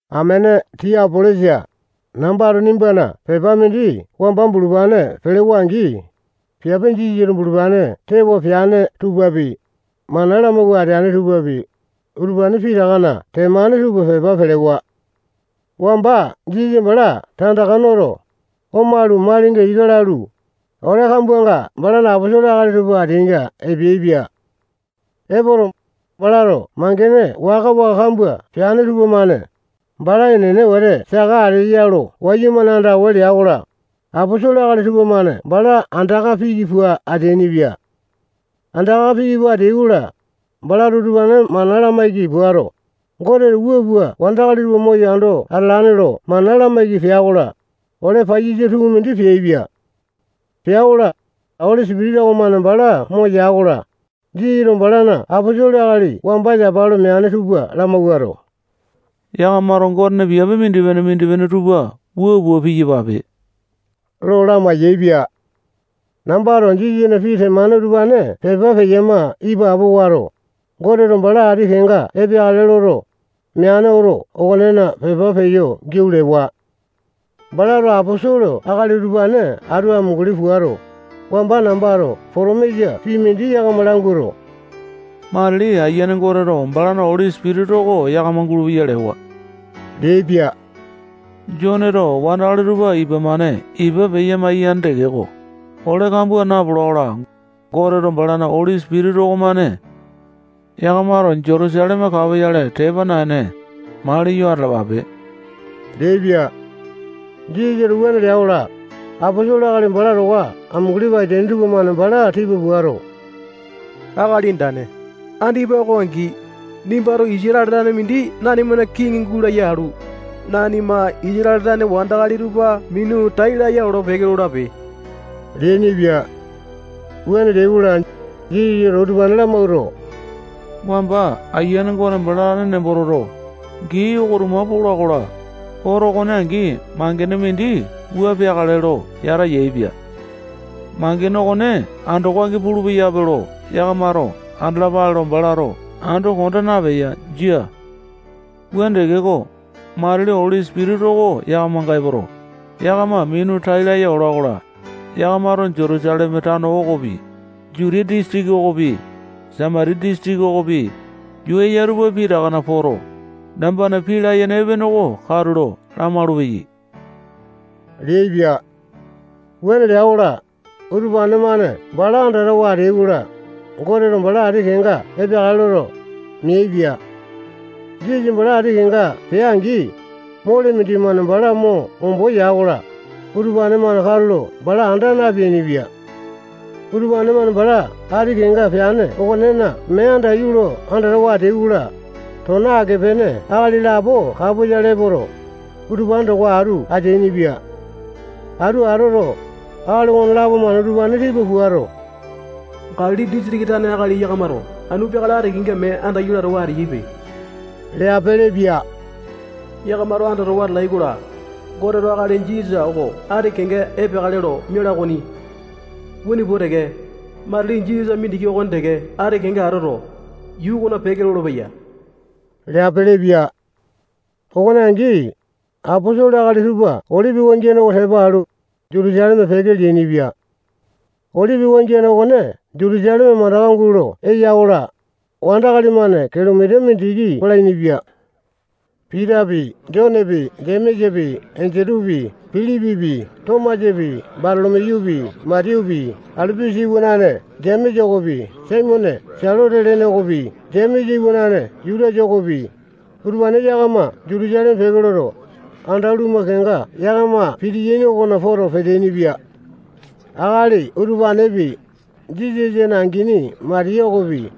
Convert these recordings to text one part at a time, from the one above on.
Amene Tiapolesa, nambato nimbana pepa mindi wamba bulupane pelewa-angi, piape Jisasato bulupane tewa peane tupapi, mana lamawua ateane tupapi, utupane pitakana temane tupa pepa pelewa. Wamba Jisasa bala tandaka noto, omalu, malinga ika lalu, ole kambuanga balana aposolo akali tupa ateainga epeaipia. Epoto, balato mangene waka-waka kambua peane tupamane, bala enene wete saka ateyo lo wayumane andawa lea-kola, aposolo akali tupamane bala andaka piki pua ateainipia. Andaka piki pua ateai-kola, balato utupane mana lamaiki puato, Goteto wua pua wandakali tupa moyo ando atalane lo mana lamaiki pea-kola, ole paiyasa tukumindi peaipia. Pea-kola, Oli Sipitisa okomane bala moya-kola, Jisasato balana aposolo akali wamba yapa lo meane tupa lamawuato, yakamato Gotena piape mindipene-mindipene tupa wua pua piyapape lo lamai-yaepia. Nambato Jisasana pii temane utupane pepa peyama ipapo wato, Goteto bala ati kenga epeakale loto, meane oto okonena pepa peyo giau lewa. Balato aposolo akali utupane atu amunguli puato, wamba nambato potomisa pii mindi yakama languato, matili Ayiane Goteto balana Oli Sipitisa oko yakama gulupeya lewa leaipia. Joneto wandakali tupa ipa-mane ipa peya-maiyane tekeko, ole kambua napola-kola, Goteto balana Oli Sipitisa okomane yakama ipa peya gulupeya-ko. Yakamato Jutusaleme kapoyale tepa naene, maliyo atalapape leaipia. Jisasato wuane lea-kola, aposolo akali bala towa amunguli pua ateaini tupamane bala tipa puato, Akali Andane, andipa oko angi, nimbato Isatale tane mindi nanimana kiŋi gulaya alu, nanima Isatale tane wandakali tupa minu tai laya olo-peke lolape leainipia. Wuane leai-kola, Jisasato utupane lamawuato, wamba Ayiane Gote bala tane nembo toto, gii oko tuma pola-kola, oto okone angi mangene mindi wua peakale lo yata yaepia. Mangene okone andoko angi pulupeya lo yakamato andalapale lo balato ando konda napeya. Jia. Wuane tekeko, matili Oli Sipitisa oko yakamanga epoto, yakama minu tai laya ola-kola, yakamato Jutusaleme tano okopi, Jutiya disitiki okopi, Samatiya disitiki okopi, yuu eya tupa pitakana poto, nambana pii layene epene oko katulo lamaulu-peyai leaipia. Wuane lea-kola, utupane-mane bala andatawa ateai-kola, Goteto bala ati kenga epeakale loto, meaipia. Jisasa bala ati kenga pea-angi, mole mindimane bala mo ombo ya-kola, utupane-mane katulo bala anda napeainipia. Utupane-mane bala ati kenga peane okonena mee andaiyu lo andatawa ateai-kola, tona ake-pene akali lapo kapoyale epoto, utupane towa atu ateainipia. Atu atoto, akali okonelapo-mane utupane tipa puato, Galili disitiki tane akali yakamato anu peakale ati kenga mee andaiyu latawa ateyaipe leapilipia. Yakamato andatawa atalai-kola, Goteto akali Jisasa oko ati kenga epeakale lo miala okoni. Wuane pua teke, matili Jisasa mindiki okone teke ati kenga atoto, yuu okona peke lolopeya leapilipia. Okone angi, aposolo akali tupa Olipi wangiane oko tepa alu, Jutusaleme peke leainipia. Olipi wangiane okone Jutusaleme mandaka gulo eya-kola, wandakali-mane kilomita mindiki palainipia. Pitapi, Jonepi, Jemesapi, Endutupi, Pilipipi, Tomasapi, Batolo-miyupi, Matiyupi, Alipusa iwanane Jemesa okopi, Saimone Selote lene okopi, Jemesa iwanane Jutasa okopi, utupane yakama Jutusaleme peke loto, anda lumu kenga yakama pitiyaini okona poto peteaini-pia. Akali utupanepi, Jisasa angini Matiya okopi,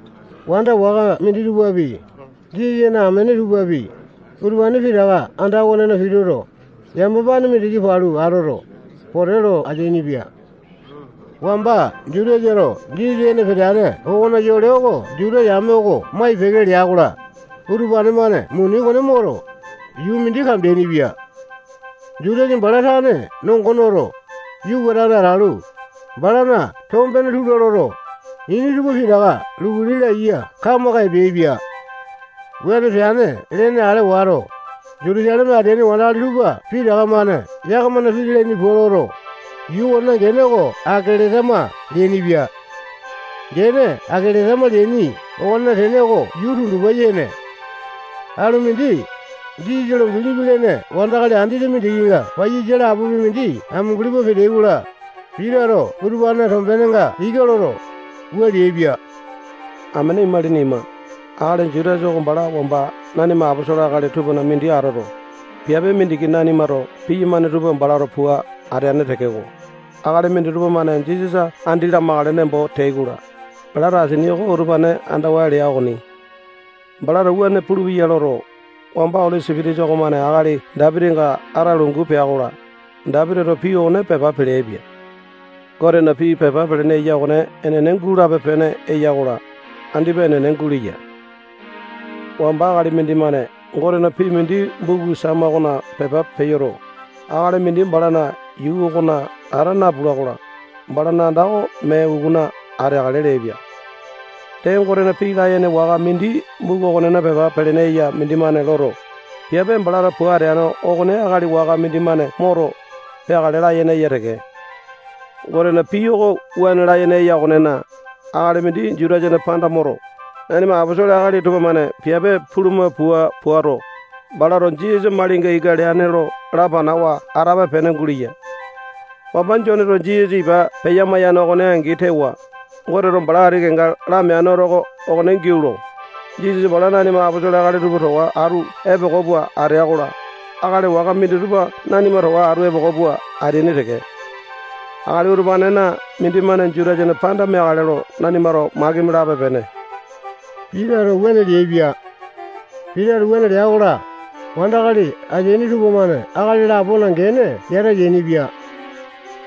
wanda waka minditupapi, Jisasana amene tupapi, utupane pitaka anda okonena pituto, yamapane mindiki palu atoto, pote lo ateainipia. Wamba Jutasato Jisasa ene peteane okona yole oko Juta yame oko mai-peke lea-kola, utupane-mane muni okone moto, yuu mindi kambeainipia. Jutasa bala tane nongo noto, yuka atane atalu, balana tombene tula loto, ini tupa pitaka lukuli laiya kamaka epeaipia. Wuane peane lene ale wato, Jutusaleme ateaini wandakali tupa pitaka-mane yakamana pii lalaini pua loto, yuu okonena gene oko Akeletama leainipia. Gene Akeletama leaini okonena tene oko yuu tundupa yene. Alu mindi, Jisasa lo bilipi lene wandakali andete mindikinga paiyasa lapopi mindi amunguli pua peteai-kola, Pitato utupanena tombenenga ika loto, wua leaipa: Amene imalini ima, akali Jutasa oko bala wamba nanima aposolo akali tupana mindi atoto, piape mindiki nanimato piyamane tupa balato pua ateane tekeko, akali minditupa-mane Jisasa andi lamakale nembo teai-kola, balato asini oko utupane andawa lea okoni. Balato wuane pulupeya loto, wamba Oli Sipitisa okomane akali Dapitinga ata lungu pea-kola, Dapitito pii okone pepa peleaipia. Gotena pii pepa pelene eya okone enene gulape-pene eya-kola, andipa enene guleya. Wamba akali mindimane Gotena pii mindi buku Sama okona pepa peyoto, akali mindi balana yuu okona ata napula-kola, balana anda oko mee ukuna ateakale leaipia. Dee, Gotena pii layene waka mindi buku okonena pepa pelene eya mindimane loto, piape balato pua ateane okone akali waka mindimane moto, peakale layene eya teke. Gotena pii oko wuane layene eya okonena, akali mindi Jutasana panda moto, nanima aposolo akali tupamane piape puluma pua puato, balato Jisasa malinga ika leane lo lapanawa atape-pene guleya. Wamba Joneto Jisasa ipa peya-maiyane okone angi tewa, Goteto bala ati kenga lameane oto okona giau lo, Jisasa bala nanima aposolo akali tupa towa atu epoko pua atea-kola, akali waka minditupa nanima towa atu epoko pua ateaini teke. Akali utupanena mindimane Jutasana panda meakale lo nanimato makimi lape-pene. Pitato wuane leaipia. Pitato wuane lea-kola, wandakali ateaini tupamane akali lapona gene yata yainipia.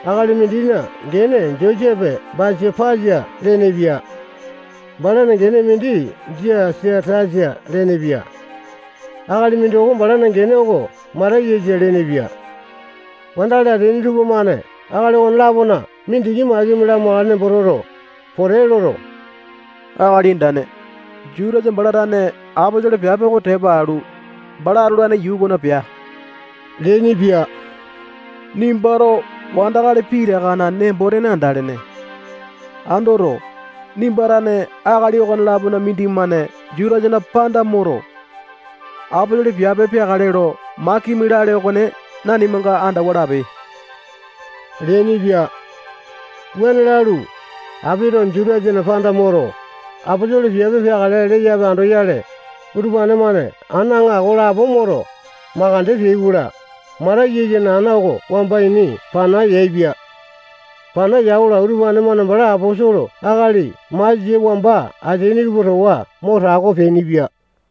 Akali mindina gene Josepe Basapasa lenepia. Balana gene mindi Jasatasa lenepia. Akali mindoko balana gene oko Matayasa lenepia. Wandakali ateaini tupamane akali okone-lapona mindiki makimi lamakale nembo toto, pote loto, Akali Andane, Jutasa bala tane aposolo piape oko tepa alu, bala atolane yuu okona pea leainipia. Nimbato wandakali pitakana nembo-tene andalene. Andoto, nimba tane akali okolapona mindimane Jutasana panda moto, aposolo piape peakale lo makimi lale okone nanimanga andawa lape leainipia. Wuane lalu, apito Jutasana panda moto, aposolo piape peakale leyape andoyale, utupane-mane ana aŋako lapo moto, makande peai-kola, Matayasana ana oko wamba ini pana yaepia. Pana ya-kola, utupane-mane bala aposolo akali masia wamba ateaini tupa towa mo tako peainipia.